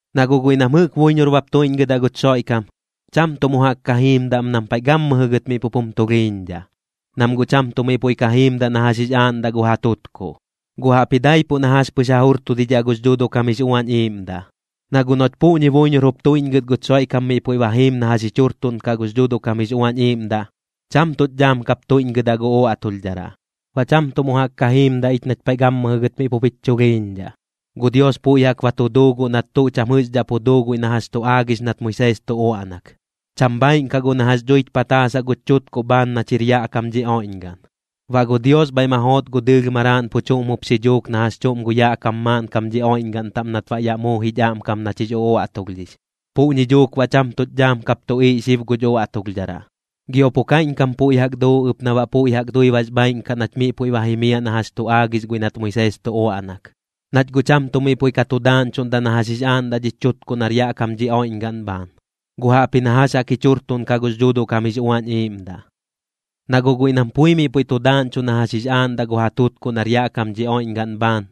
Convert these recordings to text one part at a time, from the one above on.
Na guꞌ guiꞌ nam jɨꞌk buiñor bap tuiꞌñgɨdaꞌ guch Xoiꞌkam, cham tuꞌ mu jaꞌk ka jiimdaꞌ am nam paiꞌ gammɨjɨ gɨt miꞌ pup jum tulhiiñdhaꞌ, nam guꞌ cham tuꞌ miꞌ puiꞌ ka jiimdaꞌ na jax jix aaꞌndaꞌ gu ja tutkuꞌ, guꞌ jaꞌpji daipuꞌ na jax pɨx ja jurtudidhaꞌ gux Dhuuduꞌ kam jix Uañ Iiꞌmdaꞌ. Na guꞌ noꞌch puꞌñi buiñor jup tuiꞌñgɨt guch Xoiꞌkam miꞌ puiꞌ ba jiim na jax jich jurtuꞌnkaꞌ gux Dhuuduꞌ kam jix Uañ Iiꞌmdaꞌ, cham tuꞌch dhaam kap tuiꞌñgɨdaꞌ gu uaꞌtulhdharaꞌ, baꞌ cham tuꞌ mu jaꞌk ka jiimdaꞌ ich nach paiꞌ gammɨjɨ gɨt miꞌ pup jich chulhiiñdhaꞌ. Gu Dios puiꞌ jaꞌk ba tu duu guꞌ nat tuꞌ cham jɨꞌxdhaꞌ pu duu guiꞌ na jax tu aagix nat Moisees tu uaꞌnak, cham bhaaiꞌn kaꞌ guꞌ na jax dhuich pataasaꞌ guch chutkuꞌ bhaan nach jir yaꞌ kam dhi oiꞌñgaꞌn. Baꞌ gu Dios bhaiꞌ ma joot gu dɨɨlh Maraaꞌn pu chuꞌm jup xi dhuuk na jax chuꞌm gu yaꞌ kam maaꞌnkam dhi oiꞌñgaꞌn taꞌm nat baꞌ yaꞌ muu jich aꞌmkam nach jix uaꞌtulhdhix, puꞌñi dhuuk baꞌ cham tuꞌch dhaam kap tuꞌiiꞌ xib guch uaꞌtulhdharaꞌ. Gio pu kaiꞌñkam puiꞌ jaꞌk duu ɨp na baꞌ puiꞌ jaꞌk dui bax bhaaiꞌn kaꞌ nach miꞌ puiꞌ ba jimiaꞌ na jax tu aagix guiꞌ nat Moisees tu uaꞌnak, nach guꞌ cham tuꞌ miꞌ puiꞌ ka tu daaꞌñchuꞌndaꞌ na jax jix aaꞌndaꞌ dhich chutkuꞌ nar yaꞌ kam dhi oiꞌñgaꞌn bhaan, guꞌ jaꞌpji na jax jaꞌk jich jurtuꞌnkaꞌ gux Dhuuduꞌ kam jix Uañ Iiꞌmdaꞌ. Na guꞌ guiꞌ nam pui miꞌ puiꞌ tu daaꞌñchuꞌ na jax jix aaꞌndaꞌ gu ja tutkuꞌ nar yaꞌ kam dhi oiꞌñgaꞌn bhaan,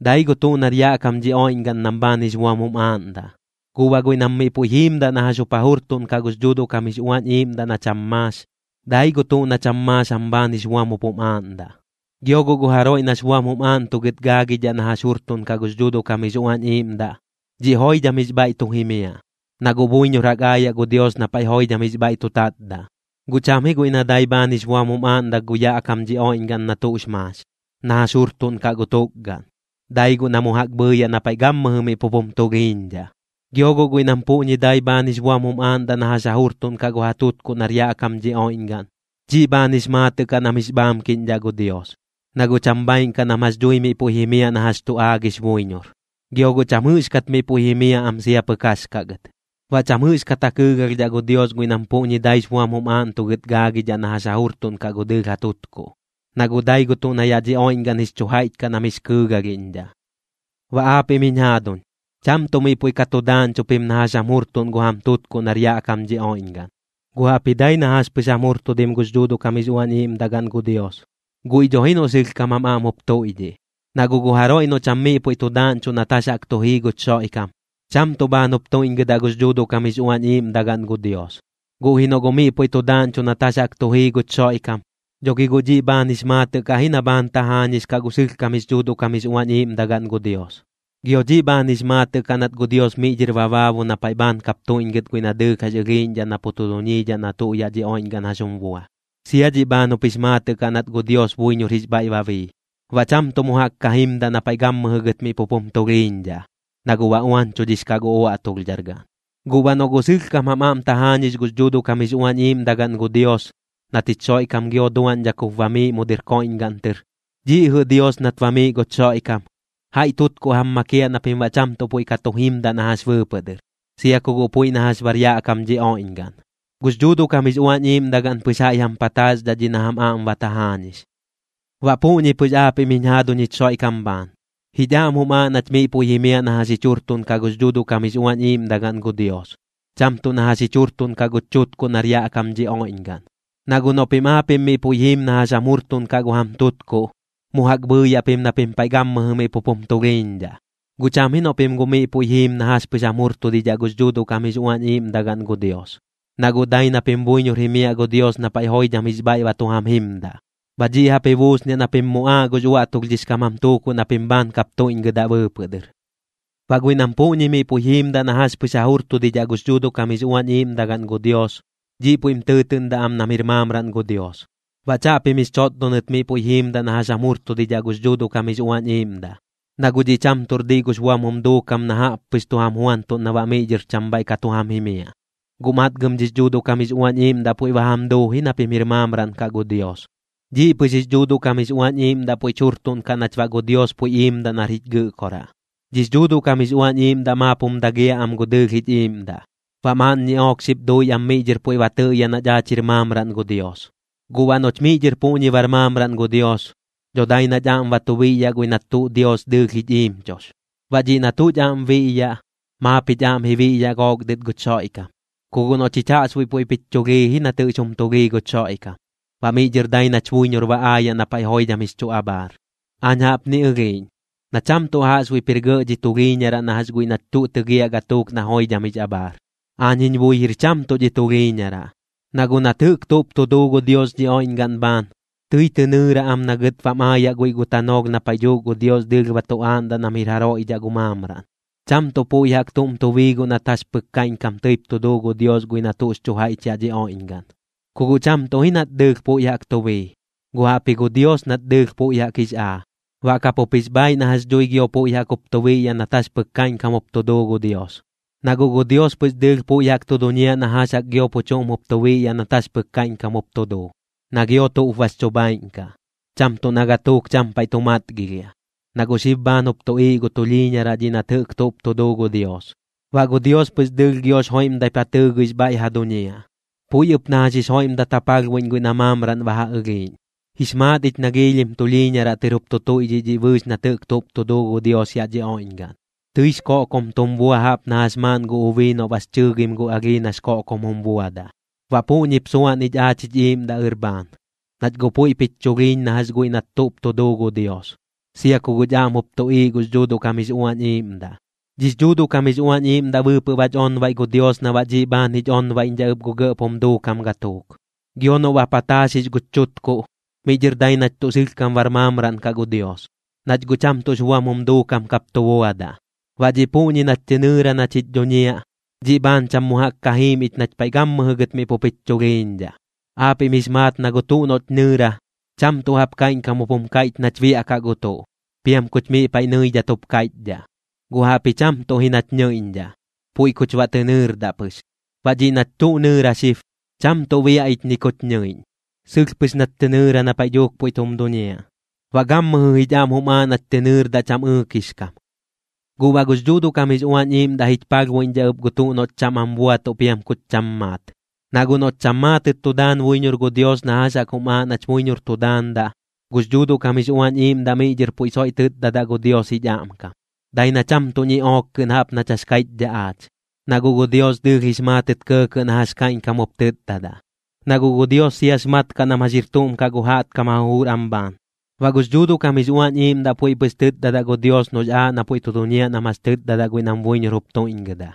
dai gu tuꞌ nar yaꞌ kam dhi oiꞌñgaꞌn nam bhaan jix buam jum aaꞌndaꞌ. Guꞌ baꞌ guiꞌ nam miꞌ puiꞌ jiimdaꞌ na jax jup ja jurtuꞌnkaꞌ gux Dhuuduꞌ kam jix Uañ Iiꞌmdaꞌ na cham maax, dai gu tuꞌ na cham maax jam bhaan jix buam jup jum aaꞌndaꞌ. Gio guꞌ gu jaroiꞌ nax buam jum aaꞌntugɨt gaagidhaꞌ na jax jurtuꞌnkaꞌ gux Dhuuduꞌ kam jix Uañ Iiꞌmdaꞌ, dhiꞌ joidham jix bhaiꞌ tu jimiaꞌ, na guꞌ buiñor jaꞌk aayaꞌ gu Dios na paiꞌ joidham jix bhaiꞌ tu tatdaꞌ. Guꞌ cham ji guiꞌ na dai bhaan jix buam jum aaꞌndaꞌ gu yaꞌ kam dhi oiꞌñgaꞌn na tuꞌx maax, na jax jurtuꞌnkaꞌ gu tukgaꞌn, dai guꞌ na mu jaꞌk bhɨɨyaꞌ na paiꞌ gammɨjɨ miꞌ pup jum tulhiiñdhaꞌ. Gio guꞌ guiꞌ nam puꞌñi dai bhaan jix buam jum aaꞌndaꞌ na jax ja jurtuꞌnkaꞌ gu ja tutkuꞌ nar yaꞌ kam dhi oiꞌñgaꞌn, dhiꞌ bhaan jix maatɨꞌ kaꞌ nam jix bhaamkiꞌñdhaꞌ gu Dios, na guꞌ cham bhaaiꞌn kaꞌ nam jax dhui miꞌ puiꞌ jimiaꞌ na jax tu aagix buiñor, gio guꞌ cham jɨꞌxkat miꞌ puiꞌ jimiaꞌ am sia pɨk jax kaꞌ gɨt. Baꞌ cham jɨꞌxkat ja kɨɨgalhdhaꞌ gu Dios guiꞌ nam puꞌñi daix buam jum aaꞌntugɨt gaagidhaꞌ na jax ja jurtuꞌnkaꞌ gu dɨɨlh ja tutkuꞌ, na guꞌ dai gu tuꞌ na yaꞌ dhi oiꞌñgaꞌn jix chu jaiꞌch kaꞌ nam jix kɨɨgalhiꞌñdhaꞌ. Baꞌ aapiꞌm jiñ jaaduñ, cham tuꞌ miꞌ puiꞌ ka tu daaꞌñchuꞌ pim na jax jam jurtuꞌn gu jam tutkuꞌ nar yaꞌ kam dhi oiꞌñgaꞌn, guꞌ jaꞌpji dai na jax pɨx jam jurtudim gux Dhuuduꞌ kam jix Uañ Iiꞌmdagaꞌn gu Dios, guiꞌ dho ji noꞌ sɨlhkam jam aꞌm jup tuiꞌdhiꞌ. Na guꞌ gu jaroiꞌ noꞌ cham miꞌ puiꞌ tu daaꞌñchuꞌ nat jax jaꞌk tu jii guch Xoiꞌkam, cham tuꞌ bhaan jup tuiꞌñgɨdaꞌ gux Dhuuduꞌ kam jix Uañ Iiꞌmdagaꞌn gu Dios. Guꞌ ji noꞌ guꞌ miꞌ puiꞌ tu daaꞌñchuꞌ nat jax jaꞌk tu jii guch Xoiꞌkam, dho gi guꞌ dhiꞌ bhaan jix maatɨꞌ kaꞌ ji na bhaan tajaañix kaꞌ gu sɨlhkam jix Dhuuduꞌ kam jix Uañ Iiꞌmdagaꞌn gu Dios. Gio dhiꞌ bhaan jix maatɨꞌ kaꞌ nat gu Dios miꞌ dhɨr ba baabu na paiꞌ bhaan kap tuiꞌñgɨt guiꞌ na dɨɨlh jax ɨlhiiꞌñdhaꞌ na pu tu duñiidhaꞌ na tuꞌ yaꞌ dhi oiꞌñgaꞌn jax jum bua. Sia dhiꞌ bhaan jup jix maatɨꞌ kaꞌ nat gu Dios buiñor jix bhaiꞌ ba bii, baꞌ cham tuꞌ mu jaꞌk ka jimdaꞌ na paiꞌ gammɨjɨ gɨt miꞌ pup jum tulhiiñdhaꞌ, na guꞌ ba uañchudhix kaꞌ gu uaꞌtulhdhargaꞌn. Guꞌ baꞌ noꞌ guꞌ sɨlhkam jam aꞌm tajaañix gux Dhuuduꞌ kam jix Uañ Iiꞌmdagaꞌn gu Dios, nat jich Xoiꞌkam gio duaꞌñdhak jup bamiiꞌ mu dɨr koiꞌñgaꞌn tɨr, dhiꞌ jɨꞌ Dios nat bamiiꞌ guch Xoiꞌkam, jaiꞌ tutkuꞌ jam makiaꞌ na pim baꞌ cham tuꞌ puiꞌ ka tu jimdaꞌ na jax bɨɨpɨꞌ dɨr, sia ku guꞌ puiꞌ na jax bar yaꞌ kam dhi oiꞌñgaꞌn. Gux Dhuuduꞌ kam jix Uañ Iiꞌmdagaꞌn pɨx jaiꞌ jam pataaxdhaꞌ dhiꞌ na jam aꞌm ba tajaañix. Baꞌ puꞌñi pɨx aapiꞌm jiñ jaaduñ jich Xoiꞌkam bhaan, jich aꞌm jum aaꞌ nach miꞌ puiꞌ jimiaꞌ na jax jich jurtuꞌnkaꞌ gux Dhuuduꞌ kam jix Uañ Iiꞌmdagaꞌn gu Dios, cham tuꞌ na jax jich jurtuꞌnkaꞌ guch chutkuꞌ nar yaꞌ kam dhi oiꞌñgaꞌn. Na guꞌ noꞌ pim aapiꞌm miꞌ puiꞌ jiim na jax jam jurtuꞌnkaꞌ gu jam tutkuꞌ, mu jaꞌk bhɨɨyaꞌ pim na pim paiꞌ gammɨjɨ miꞌ pup jum tulhiiñdhaꞌ. Guꞌ cham ji noꞌ pim guꞌ miꞌ puiꞌ jiim na jax pɨx jam jurtudidhaꞌ gux Dhuuduꞌ kam jix Uañ Iiꞌmdagaꞌn gu Dios, na guꞌ dai na pim buiñor jimiaꞌ gu Dios na paiꞌ joidham jix bhaiꞌ ba tu jam jimdaꞌ. Baꞌ dhiꞌ jaꞌp ji buusniaꞌ na pim muꞌaaꞌ gux uaꞌtulhdhix kam jam tuukuꞌ na pim bhaan kap tuiꞌñgɨdaꞌ bɨɨpɨꞌ dɨr. Baꞌ guiꞌ nam puꞌñi miꞌ puiꞌ jiimdaꞌ na jax pɨx ja jurtudidhaꞌ gux Dhuuduꞌ kam jix Uañ Iiꞌmdagaꞌn gu Dios, dhiꞌ puiꞌm tɨɨtɨꞌndaꞌ am nam jir maamraꞌn gu Dios. Baꞌ chaꞌpim jix chotdonɨt miꞌ puiꞌ jiimdaꞌ na jax jam jurtudidhaꞌ gux Dhuuduꞌ kam jix Uañ Iiꞌmdaꞌ. Na guꞌ dhiꞌ cham tuꞌr diꞌ gux buam jum duukam na jaꞌp pɨx tu jam juantuꞌn na baꞌ miꞌ dhɨr cham bhaiꞌ ka tu jam jimiaꞌ, guꞌ matgɨm dhix Dhuuduꞌ kam jix Uañ Iiꞌmdaꞌ puiꞌ ba jam duu ji na pim jir maamraꞌn kaꞌ gu Dios. Dhiꞌ pɨx jix Dhuuduꞌ kam jix Uañ Iiꞌmdaꞌ puiꞌch jurtuꞌnkaꞌ nach baꞌ gu Dios puiꞌ iimdaꞌ nar jich Gɨꞌkoraꞌ. Dhix Dhuuduꞌ kam jix Uañ Iiꞌmdaꞌ maap jum dagiaꞌ am gu dɨɨlh jich iiꞌmdaꞌ, baꞌ maaꞌn ñiꞌook xip dui am miꞌ dhɨr puiꞌ ba tɨꞌyaꞌ nach aach jir maamraꞌn gu Dios. Guꞌ baꞌ noꞌch miꞌ dhɨr puꞌñi bar maamraꞌn gu Dios, dho dai nach aꞌm ba tu biꞌyaꞌ guiꞌ nat tuꞌ Dios dɨɨlh jich iimchux. Baꞌ dhiꞌ na tuꞌch aꞌm biꞌyaꞌ, maap jich aꞌm ji biꞌyaꞌ gook dɨt guch Xoiꞌkam, ku guꞌ noꞌ chich jaꞌxbuiꞌ puiꞌp jich chulhii ji nat jax jum tulhii guch Xoiꞌkam, baꞌ miꞌ dhɨr dai nach buiñor ba aayaꞌ na paiꞌ joidham jix chu abhaar. Aañ jaꞌpni ɨlhiiꞌñ, na cham tuꞌ jaꞌxbuiꞌp jir gɇꞌ dhi tulhiiñaraꞌ na jax guiꞌ nach tuꞌ tɨgiaꞌ gatuuk na joidham jix abhaar. Aañ jiñ bui jir cham tuꞌ dhi tulhiiñaraꞌ. Na guꞌ nat jɨꞌk tuꞌp tu duu gu Dios dhi oiꞌñgaꞌn bhaan, tɨi tɨ nɨɨra am na gɨt bam aayaꞌ guiꞌ gu tanoolh na paiꞌ dhuuk gu Dios dɨɨlh ba tu aaꞌndaꞌ nam jir jaroiꞌ dhaꞌ gu maamraꞌn. Cham tuꞌ puiꞌ jaꞌk tuꞌm tu bii guꞌ nat jax pɨk kaiꞌñkam tɨip tu duu gu Dios guiꞌ na tuꞌx chu jaiꞌch yaꞌ dhi oiꞌñgaꞌn. Ku guꞌ cham tuꞌ ji nat dɨɨlh puiꞌ jaꞌk tu bii, guꞌ jaꞌpji gu Dios nat dɨɨlh puiꞌ jaꞌk jix aa, baꞌ kapup jix bhaaiꞌ na jax dhui gio puiꞌ jaꞌk jup tu biꞌyaꞌ nat jax pɨk kaiꞌñkam jup tu duu gu Dios. Na guꞌ gu Dios pɨx dɨɨlh puiꞌ jaꞌk tu duñiaꞌ na jax jaꞌk gio pu chuꞌm jup tu biꞌyaꞌ nat jax pɨk kaiꞌñkam jup tu duu, na gio tuꞌp bax chu bhaaiꞌn kaꞌ, cham tuꞌ na gatuuk cham paiꞌ tu matgilhiaꞌ. Na guꞌ xib bhaan jup tuꞌiiꞌ gu tulhiiñaraꞌ dhiꞌ nat jɨꞌk tuꞌp tu duu gu Dios. Baꞌ gu Dios pɨx dɨɨlh giox joiꞌmdaip ja tɨɨgɨix bhaiꞌ ja duñiaꞌ, puiꞌ ɨp na jax jix joiꞌmdat ja palhbuiꞌñ guiꞌ na maamraꞌn ba ja ɨlhiiꞌñ. Jix maat ich na giilhim tulhiiñaraꞌ tɨr jup tu tuiꞌdhiꞌ dhiꞌ bɨɨx nat jɨꞌk tuꞌp tu duu gu Dios yaꞌ dhi oiꞌñgaꞌn, tɨix koꞌkom tum bua jaꞌp na jax maaꞌn gu ubii noꞌ bax chɨɨgim gu alhii nax koꞌkom jum buadaꞌ. Baꞌ puꞌñip suan ich aach jich iiꞌmdaꞌ ɨr bhaan, nach guꞌ puiꞌp jich chulhiiñ na jax guiꞌ nat tuꞌp tu duu gu Dios, sia ku guꞌch aꞌm jup tuꞌiiꞌ gux Dhuuduꞌ kam jix Uañ Iiꞌmdaꞌ. Dhix Dhuuduꞌ kam jix Uañ Iiꞌmdaꞌ bɨɨpɨꞌ bach onbaiꞌ gu Dios na baꞌ dhiꞌ bhaan jich onbaiꞌñdhaꞌ ɨp gu gɇꞌp jum duukam gatuuk. Gio noꞌ ba pataaxix guch chutkuꞌ, miꞌ dhɨr dai nach tuꞌ sɨlhkam bar maamraꞌn kaꞌ gu Dios, nach guꞌ cham tuꞌx buam jum duukam kap tu buadaꞌ. Baꞌ dhiꞌ puꞌñi nach tɨ nɨɨra nach jich dhuñiaꞌ, dhiꞌ bhaan cham mu jaꞌk ka jiim ich nach paiꞌ gammɨjɨ gɨt miꞌ pup jich chulhiiñdhaꞌ. Aapiꞌm jix maat na gu tuꞌ noꞌch nɨɨra, cham tuꞌ jaꞌp kaiꞌñkam jup jum kaiꞌch nach biaꞌkaꞌ gu tuꞌ, piam kuch miꞌ paiꞌ nɨidhat jup kaiꞌchdhaꞌ, guꞌ jaꞌpji cham tuꞌ ji nach nɨiꞌñdhaꞌ, puiꞌ kuch baꞌ tɨ nɨɨrdaꞌ pɨx. Baꞌ dhiꞌ nach tuꞌ nɨɨra xib, cham tuꞌ biaꞌ ich ni kuch nɨiꞌñ. Sɨlh pɨx nach tɨ nɨɨra na paiꞌ dhuuk puiꞌ tum duñiaꞌ, baꞌ gammɨjɨ jich aꞌm jum aaꞌ nach tɨ nɨɨrdaꞌ cham ɨɨkix kam. Guꞌ baꞌ gux Dhuuduꞌ kam jix Uañ Iiꞌmdaꞌ jich palhbuiꞌñdhaꞌ ɨp gu tuꞌ noꞌch cham am buatuꞌ piam kuch cham maat. Na guꞌ noꞌch cham maatɨt tu daan buiñor gu Dios na jax jaꞌk jum aaꞌ nach buiñor tu daandaꞌ, gux Dhuuduꞌ kam jix Uañ Iiꞌmdaꞌ miꞌ dhɨr puiꞌ soiꞌ tɨtdadaꞌ gu Dios jich aꞌmkam, dai na cham tuꞌ ñiꞌook kɨꞌn jaꞌp nach jax kaiꞌchdhaꞌ aach. Na guꞌ gu Dios dɨɨlh jix maatɨt kɇɇkɇꞌ na jax kaiꞌñkam jup tɨtdadaꞌ, na guꞌ gu Dios siax mat kaꞌ nam jax jir tuꞌm kaꞌ gu jaꞌtkam ja jujur am bhaan. Baꞌ gux Dhuuduꞌ kam jix Uañ Iiꞌmdaꞌ puiꞌ pɨx tɨtdadaꞌ gu Dios noꞌx aaꞌ na puiꞌ tu duñiaꞌ nam jax tɨtdadaꞌ guiꞌ nam buiñor jup tuiꞌñgɨdaꞌ.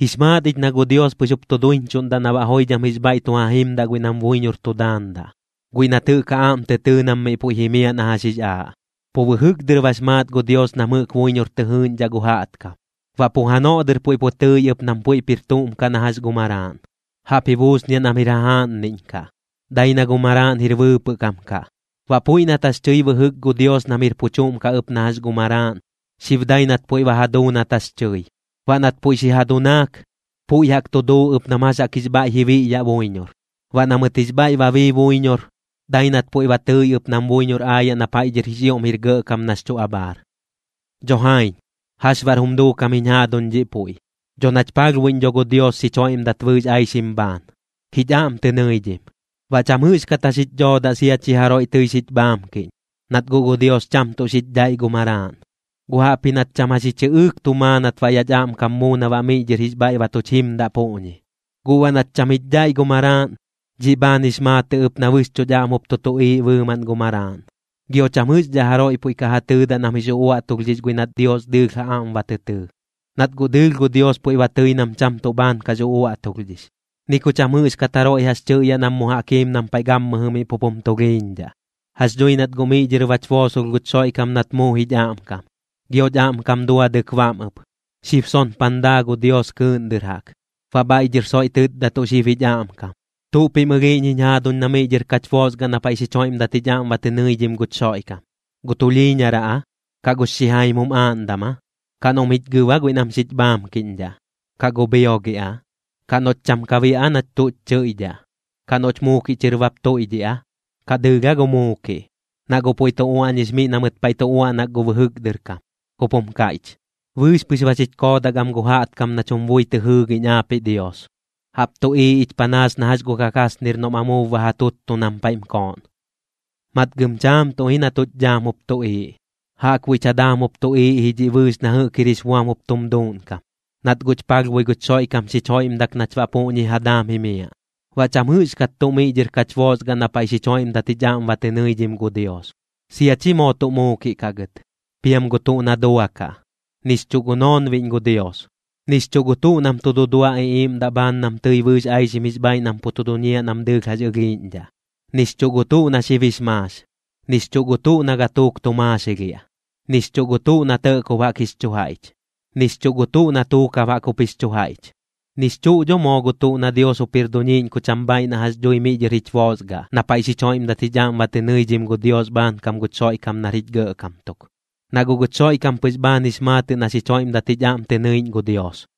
Jix maat ich na gu Dios pɨx jup tu duiñchuꞌndaꞌ na baꞌ joidham jix bhaiꞌ tu ja jimdaꞌ guiꞌ nam buiñor tu daandaꞌ, guiꞌ nat jɨꞌk ja aꞌm tɨ tɨɨ nam miꞌ puiꞌ jimiaꞌ na jax jix aaꞌ. Pu bɨjɨk dɨr bax maat gu Dios nam jɨꞌk buiñor tɨ jɨɨꞌñdhaꞌ gu jaꞌtkam, baꞌ pu janoꞌ dɨr puiꞌ pu tɨi ɨp nam puiꞌp jir tuꞌm kaꞌ na jax gu Maraaꞌn. Jaꞌp ji buusniaꞌ nam jir jajaaꞌnniꞌñ kaꞌ, dai na gu Maraaꞌn jir bɨɨpɨꞌ kam kaꞌ. Baꞌ puiꞌ nat jax tɨi bɨjɨk gu Dios nam jir pu chuꞌm kaꞌ ɨp na jax gu Maraaꞌn, xib dai nat puiꞌ ba ja duu nat jax tɨi. Baꞌ nat puiꞌ xi ja dunaak, puiꞌ jaꞌk tu duu ɨp nam jax jaꞌk jix bhaiꞌ ji biꞌyaꞌ buiñor. Baꞌ na mɨt jix bhaiꞌ ba bii buiñor, dai nat puiꞌ ba tɨi ɨp nam buiñor aayaꞌ na paiꞌ dhɨr jix ioꞌm jir gɇꞌkam nax chu abhaar. Dho jaiñ, ¿jax baꞌr jum duukam jiñ jaaduñ dhiꞌ puiꞌ? Dho nach palhbuiꞌñ dho gu Dios xich joiꞌmdat bɨɨx aixim bhaan, jich aꞌm tɨ nɨidhim. Baꞌ cham jɨꞌxkat jax jich dhoodaꞌ sia chi jaroiꞌ tɨi xich bhaamkiꞌñ. Nat guꞌ gu Dios cham tuꞌ xich dhaiꞌ gu Maraaꞌn, guꞌ jaꞌpji nat cham jax ji chɨꞌɨɨk tu maa nat baꞌ yaꞌch aꞌmkam muu na baꞌ miꞌ dhɨr jix bhaiꞌ ba tuch jimdaꞌ puꞌñi. Guꞌ baꞌ nat cham jich dhaiꞌ gu Maraaꞌn, dhiꞌ bhaan jix maatɨꞌ ɨp na bɨxchuꞌch aꞌm jup tu tuꞌiiꞌ bɨɨmaꞌn gu Maraaꞌn. Gio cham jɨꞌxdhaꞌ jaroiꞌ puiꞌ ka ja tɨɨdaꞌ nam jix uꞌuaꞌtulhdhix guiꞌ nat Dios dɨɨlh ja aꞌm ba tɨ tɨɨ, nat guꞌ dɨɨlh gu Dios puiꞌ ba tɨi nam cham tuꞌ bhaan kax uꞌuaꞌtulhdhix. Ni ku cham jɨꞌxkat jaroiꞌ jax tɨꞌyaꞌ nam mu jaꞌk jiim nam paiꞌ gammɨjɨ miꞌ pup jum tulhiiñdhaꞌ. Jax dhui nat guꞌ miꞌ dhɨr bach boosolh guch Xoiꞌkam nat muu jich aꞌmkam, gioch aꞌmkam duadɨk bam ɨp. Xib sonpan daa gu Dios kɨɨꞌn dɨr jaꞌk, baꞌ bhaiꞌ dhɨr soiꞌ tɨtdatuꞌ xib jich aꞌmkam. ¿Tuꞌ pim ɨlhiiꞌñ jiñ jaaduñ na miꞌ dhɨr kach boosgaꞌ na paiꞌ xich joiꞌmdat jich aꞌm ba tɨ nɨidhim guch Xoiꞌkam? ¿Gu tulhiiñaraꞌ aa? ¿Kaꞌ gux xijaim jum aaꞌndam aa? ¿Kaꞌ noꞌm jich gɨb aa guiꞌ nam xich bhaamkiꞌñdhaꞌ? ¿Kaꞌ gu bhiogiꞌ aa? ¿Kaꞌ noꞌch cham ka biaꞌ aa nach tuꞌch chɨiꞌdhaꞌ? ¿Kaꞌ noꞌch muukiꞌ chɨr bap tuiꞌdhiꞌ aa? ¿Kaꞌ dɨɨlh aa gu muukiꞌ? Na guꞌ puiꞌ tu uaꞌñix miꞌ na mɨt paiꞌ tu uaꞌnak gu bɨjɨk dɨr kam, jup jum kaiꞌch: Bɨɨx pɨx ba xich koodak am gu jaꞌtkam nach jum bui tɨ jɨɨgiꞌñ aapiꞌ Dios, jaꞌp tuꞌiiꞌ ich panaas na jax gu kakasnir noꞌm amuub ba ja tuttu nam paiꞌm kooꞌn. Matgɨm chaam tuꞌ ji na tuꞌch dhaam jup tuꞌiiꞌ. Jaꞌkbuiꞌch ja daam jup tuꞌiiꞌ ji dhiꞌ bɨɨx na jɨꞌk jir jix buam tum duuꞌnkam, nat guꞌch palhbui guch Xoiꞌkam xich joiꞌmdak nach baꞌ puꞌñi ja daam jimiaꞌ. Baꞌ cham jɨꞌxkat tuꞌ miꞌ dhɨr kach boosgaꞌ na paiꞌ xich joiꞌmdat jich aꞌm ba tɨ nɨidhim gu Dios, sia chi moo tuꞌ muukiꞌ kaꞌ gɨt, piam gu tuꞌ na duakaꞌ, nix chuꞌ gu noonbiꞌñ gu Dios, nix chuꞌ gu tuꞌ nam tu dudua iꞌiiꞌmdaꞌ bhaan nam tɨi bɨɨx aixim jix bhaaiꞌ nam pu tu duñiaꞌ nam dɨɨlh jax ɨlhiiꞌñdhaꞌ, nix chuꞌ gu tuꞌ na xib jix maax, nix chuꞌ gu tuꞌ na gatuuk tu maaxilhiaꞌ, nix chuꞌ gu tuꞌ na tɇꞌkob jaꞌk jix chu jaiꞌch, nix chuꞌ gu tuꞌ na tuukab jaꞌk jup jix chu jaiꞌch, nix chuꞌ dho moo gu tuꞌ na Dios jup jir duñiiꞌñ ku cham bhaaiꞌ na jax dhui miꞌ dhɨr jich boosgaꞌ, na paiꞌ xich joiꞌmdat jich aꞌm ba tɨ nɨidhim gu Dios bhaankam guch Xoiꞌkam nar jich Gɇꞌkam tuk, na guꞌ guch Xoiꞌkam pɨx bhaan jix maatɨꞌ na xich joiꞌmdat jich aꞌm tɨ nɨiꞌñ gu Dios.